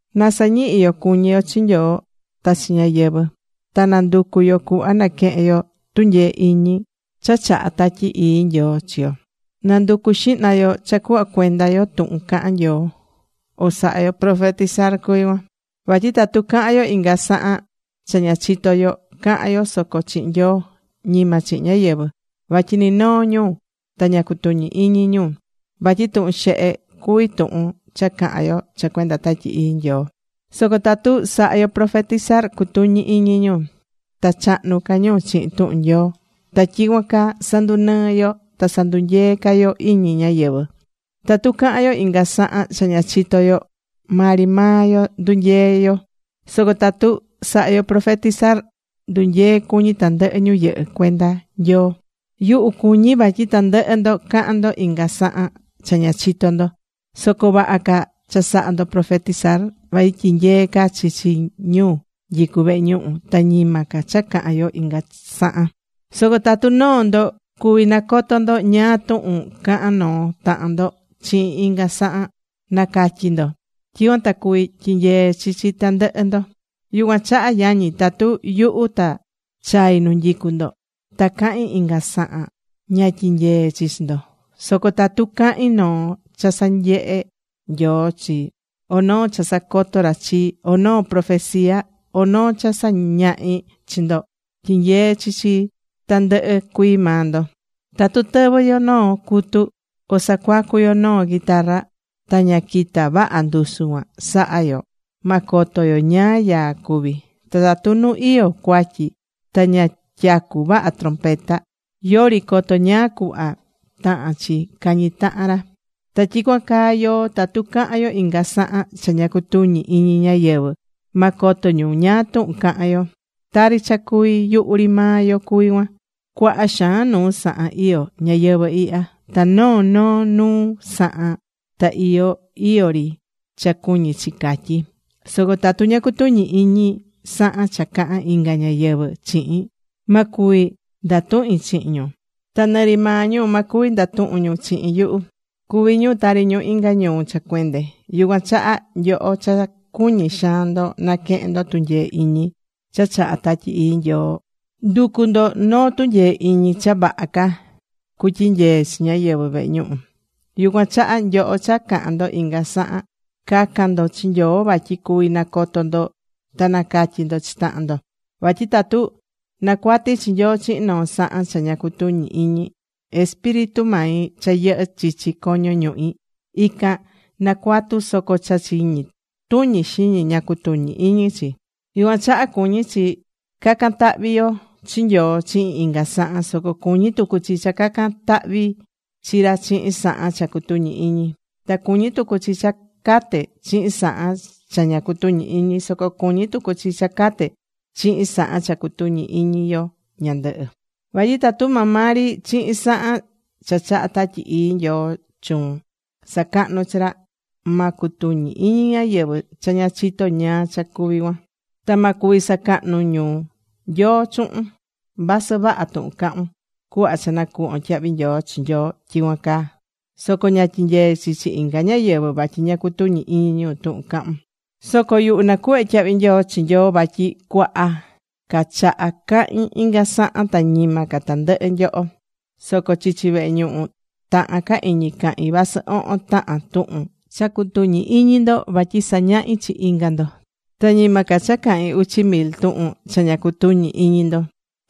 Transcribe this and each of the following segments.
Na sañihi yo cuñí yo chi Nyoo ta chi ñáyɨvɨ. Ta na nducu yo cuhva naquehen yo tunyee iñi cha chahá Tatyi Ii Nyoo chi yo. Na nducu xihna yo cha cuhva cuenda yo tuhun cahán Nyoo, o sahá yo profetizar cuví cuan. Vatyi tatu cahán yo inga sahan cha ña chitó yo, cahán yo soco chihin Nyoo. Ñima chihin ñáyɨvɨ. Vatyi ni noo ñu ta ña cutuñí iñi ñu. Vatyi tuhun xehe cuví tuhun cha cahán yo cha cuenda Tatyi Ii Nyoo. Soco tatu sahá yo profetizar, cutuñí iñi ñu. Ta chahnu ca ñu chihin tuhun Nyoo. Ta tyicuan caa sandunɨɨ́ yo ta sandunyeé ca yo iñi ñáyɨvɨ. Tatu cahán yo inga sahan cha ña chitó yo, maa ri maa yo ndunyeé yo. Soco tatu sahá yo profetizar, ndunyeé cuñi tandɨhɨ ñu yɨhɨ́ cuenda Nyoo. Yuhu cuñí vatyi tandɨhɨ ndo cahán ndo inga sahan cha ña chitó ndo. Soco vaha ca cha saha ndo profetizar. Vatyi tyinyeé ca chi chi ñu nyicú vehe ñuhu ta ñima ca cha cahán yo inga sahan. Soco tatu noo ndo cuví nacoto ndo ñáá tuhun cahán noo tahan ndo chihin inga sahan, na̱catyi ndo. Tyicuan ta cuví tyinyee chi chi tandɨhɨ ndo. Yucuan chaha yañi, tatu yuhu ta chai nu nyicu ndo, ta cahín inga sahan, ña tyinyeé chi chi ndo. Soco tatu cahín noo cha sanyehe̱ Nyoo chii, o noo cha sacoto̱ ra chii, o noo profesia, o noo cha sañahi chi ndo, tyinyeé chi chi tandɨhɨ cuii maa ndo. Tatu tɨvɨ́ yo noo cutu, o sacuacu yo noo guitarra ta ña quita vaha ndusu cuan sahá yo, ma coto yo ñáá yaa cuví. Ta tatu nu iyó cuatyi ta ña tyacú vaha trompeta, yori coto ñáá cuhva tahán chi cañi tahan ra. Ta tyicuan caa yoó, tatu cahán yo inga sahan cha ña cutuñí iñi ñáyɨvɨ, ma coto ñu ñáá tuhun cahán yo. Tari cha cuví yuhu ri maa yo cuví cuan. Cuaha xaan nuu sahan iyó ñayɨvɨ̱ ihya. Ta noo noo nuu sahan ta iyó iyó ri cha cuñí chi catyí. Soco tatu ña cutuñí iñi sahan cha cahán inga ñáyɨvɨ chihin, ma cuvi ndatuhin chihin ñu. Ta nɨ ri maa ñu ma cuvi ndatuhun ñu chihin yuhu. Cuví ñu tari ñu inga ñuu cha cuende. Yucuan chaha nyoho cha cuñí xaan ndo naquehén ndo tunyee iñi cha chahá Tatyi Ii Nyoo, ndu̱cu ndo noo tunyee iñi cha vaha ca cutyinyee chi ñáyɨvɨ vehe ñuhu. Yucuan chaha nyoho cha cahán ndo inga sahan, ca̱can ndo chi Nyoo vatyi cuvi nacoto ndo ta nacatyi ndo chi tahan ndo. Vatyi tatu nacuatí chi Nyoo chihin noo sahan cha ña cutuñi iñi, espíritu mai cha yɨhɨ́ chichi coño ñuhi ican nacuatu soco cha chiñi tuñi xiñi ña cutuñí iñi chi. Yucuan chaha cuñí chi ca̱can tahvi chi Nyoo chihin inga sahan. Soco cuñí tucu chi cha ca̱can tahvi chi ra chihin sahan cha cutuñí iñi. Ta cuñí tucu chi cha cate chihin sahan cha ña cutuñí iñi, Soco cuñí tucu chi cha cate chihin sahan cha cutuñí iñi yo ñandɨhɨ. Vatyi tatu maa maa ri chihin sahan cha chahá Tatyi Ii Nyoo chuun, sacahnún chi ra, ma cutuñi iñi ñáyɨvɨ cha ña chitó ñáá cha cuví cuan. Ta ma cuvi sacahnu ñu Nyoo chuhun. Vasɨ vaha tuhun cahún, cuhva cha nacuhvón tyahvi nyoo chi Nyoo tyicuan caa, soco ña tyinyeé chi chi inga ñáyɨvɨ vatyi ña cutuñí iñi ñu tuhun cahún. Soco yuhu nacuhvé tyahvi nyoo chi Nyoo vatyi cuaha ca chaha cahin inga sahan ta ñima ca tandɨhɨ nyoho. Soco chichi vehe ñuhu tahan ca iñi cahín vasɨ ohon tahan tuhun cha cutuñi iñi ndo vatyi sañahi chi inga ndo, ta ñima ca cha cahín uchi mil tuhun cha ña cutuñí iñi ndo.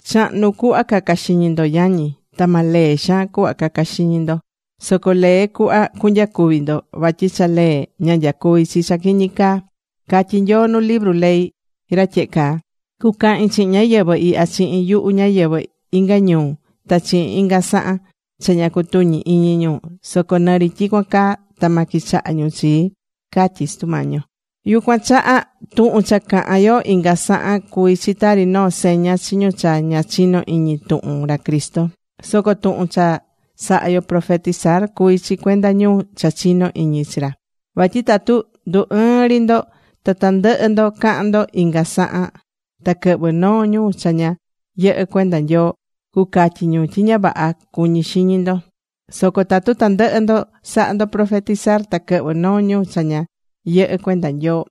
Chahnu cuhva ca̱ca xiñi ndo, yañi. Ta ma lee xaan cuhva caca xiñi ndo. Soco lee cuhva cunyacuvi ndo. Vatyi cha lee ña nyacuví chi cha quiñi caa. Catyí Nyoo nu libru ley ra tyehe caa: “Cucahin chihin ñáyɨvɨ ihya chihin yuhu ñáyɨvɨ inga ñuu ta chihin inga sahan. Cha ña cutuñí iñi ñu. Soco nɨ ri tyicuan caa ta ma quichaha ñu chii”, catyí Sutu Mañi yo. Yucuan chaha tuhun cha cahán yo inga sahan cuví chi tari noo seña chi ñu cha ña chino iñi tuhun ra Cristo. Soco tuhun cha sahá yo profetizar, cuví chi cuenda ñu cha chinó iñi chi ra. Vatyi tatu ndu ɨɨ́n ri ndo, ta tandɨhɨ ndo cahán ndo inga sahan ta quɨhvɨ́ noo ñu cha ña yɨhɨ́ cuenda Nyoo, cucatyi ñu tyi ña vaha cuñí xiñi ndo. Soco tatu tandɨhɨ ndo sahá ndo profetizar, ta quɨhvɨ́ noo ñu cha ña yɨhɨ́ cuenda Nyoo,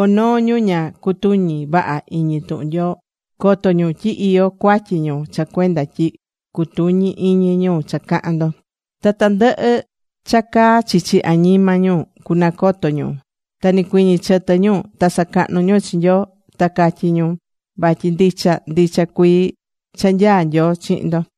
o noo ñu ña cutuñí vaha iñi tuhun Nyoo, coto ñu tyi iyó cuatyi ñu cha cuenda tyi cutuñí iñi ñu cha cahán ndo. Ta tandɨhɨ cha caa chichi añima ñu cunacoto ñu. Ta nicuiñi chɨtɨ ñu ta sacahnu ñu chi Nyoo. Ta catyi ñu vatyi ndicha ndicha cuii cha nyaá Nyoo chihin ndo.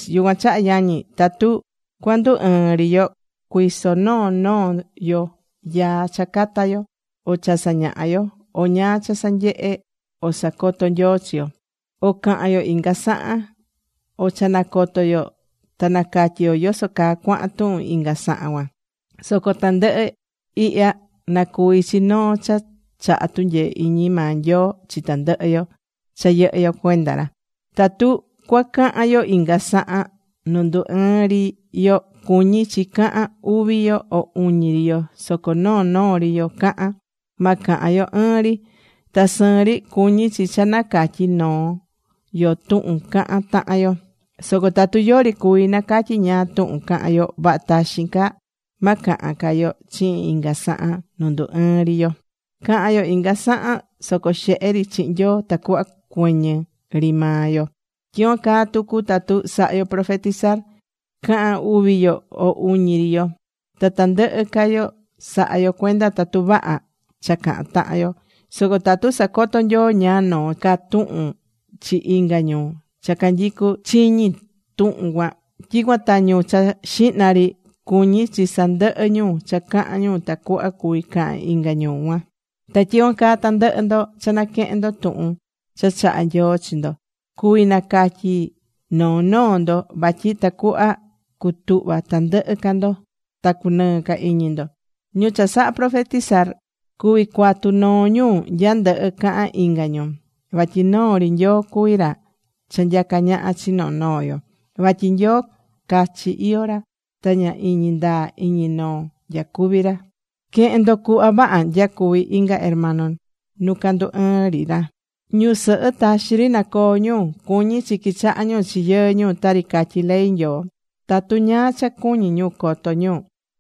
Yucuan chaha yañi, tatu cuandu ɨɨn ri yo, cui̱so noo noo yo yaa cha cata yo, o cha sañaha yo, o ñáá cha sanyehe o sacoto Nyoo chi yo, o cahan yo inga sahan, o cha nacoto yo ta nacatyi yo yoso caa cuahán tuhun inga sahan cuan. Soco tandɨhɨ ihya nacuvi chi noo cha chahá tunyee iñi maa Nyoo chi tandɨhɨ yo cha yɨhɨ́ yo cuenda ra. Tatu cuacahan yo inga sahan nu ndu ɨɨ́n ri yo, cuñí chi cahan uvi yo o uñi ri yo, soco noo noo ri yo cahan. Ma cahan yo ɨɨn ri. Ta sɨɨn ri cuñí chi cha nacatyí noo yo tuhun cahán tahan yo. Soco tatu yori cuví nacatyi ñáá tuhun cahán yo, vaha taxin ca ma cahan ca yo chihin inga sahan nu ndu ɨɨ́n ri yo. Ca̱han yo inga sahan soco xehe ri chihin Nyoo tacuhva cuɨñɨ ri maa yo. Tyicuan caa tucu tatu sahá yo profetizar, ca̱han uvi yo, o uñi ri yo. Ta tandɨhɨ ca yo sa̱ha yo cuenda tatu vaha cha cahán tahan yo. Soco tatu sacoto Nyoo ñáá noo ca tuhun chi inga ñu cha canyicú chiñi tuhun cuan. Tyicuan ta ñu cha xihna ri, cuñí chi sandɨhɨ ñu cha cahán ñu tacuhva cuvi cahan inga ñu cuan. Ta tyicuan caa tandɨhɨ ndo cha naquehén ndo tuhun cha chahá Nyoo chi ndo cuví nacatyi noo noo ndo. Vatyi tacuhva cutuhva tandɨhɨ ca ndo ta cunɨɨ ca iñi ndo. Ñu cha sahá profetizar cuví cuatu noo ñu nya ndɨhɨ cahán inga ñu. Vatyi noo ri Nyoo cuví ra cha nyacá ñaha chi noo noo yo. Vatyi Nyoo cachi iyó ra ta ña iñi ndaa iñi noo nyacuví ra. Que̱hen ndo cuhva vaha nyacuví inga hermano nu ca ndu ɨɨn ri ra. Ñusɨhɨ taxi ri na coo ñu. Cuñí chi quichaha ñu chi yɨɨ ñu tari catyí ley Nyoo. Tatu ñáá cha cuñí ñu coto ñu,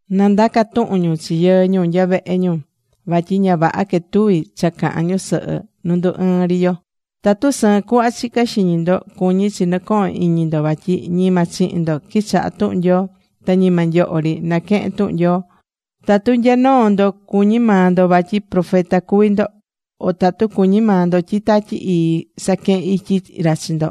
na ndaca tuhun ñu chi yɨɨ ñu nya vehe ñu. Vatyi ña vaha quetuví cha cahán ñusɨhɨ nu ndu ɨɨ́n ri yo. Tatu sɨɨn cuhva chicá xiñi ndo, cuñí chi nɨcohón iñi ndo vatyi ñima chihin ndo quichaha̱ tuhun Nyoo. Ta ñima nyoho ri naquehén tuhun Nyoo. Tatu nya noo ndo cuñí maa ndo vatyi profeta cuví ndo, o tatu cuñí maa ndo tyi Tatyi Ii saquehén ityi ra chi ndo,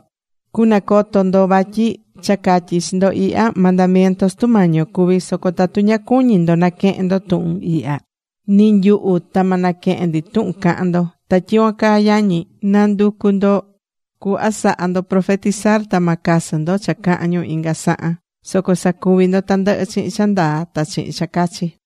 cunacoto ndo vatyi cha catyí chi ndo ihya, mandamiento Sutu Mañi yo cuví. Soco tatu ña cuñí ndo naquehén ndo tuhun ihya, ni nyuhu ta ma naquehen ndi tuhun cahán ndo. Ta tyicuan caa yañi, na nducu ndo cuhva saha ndo profetizar. Ta ma casɨ ndo cha cahán ñu inga sahan. Soco sa̱cuvi ndo tandɨhɨ chihin cha ndaa ta chihin cha cachi.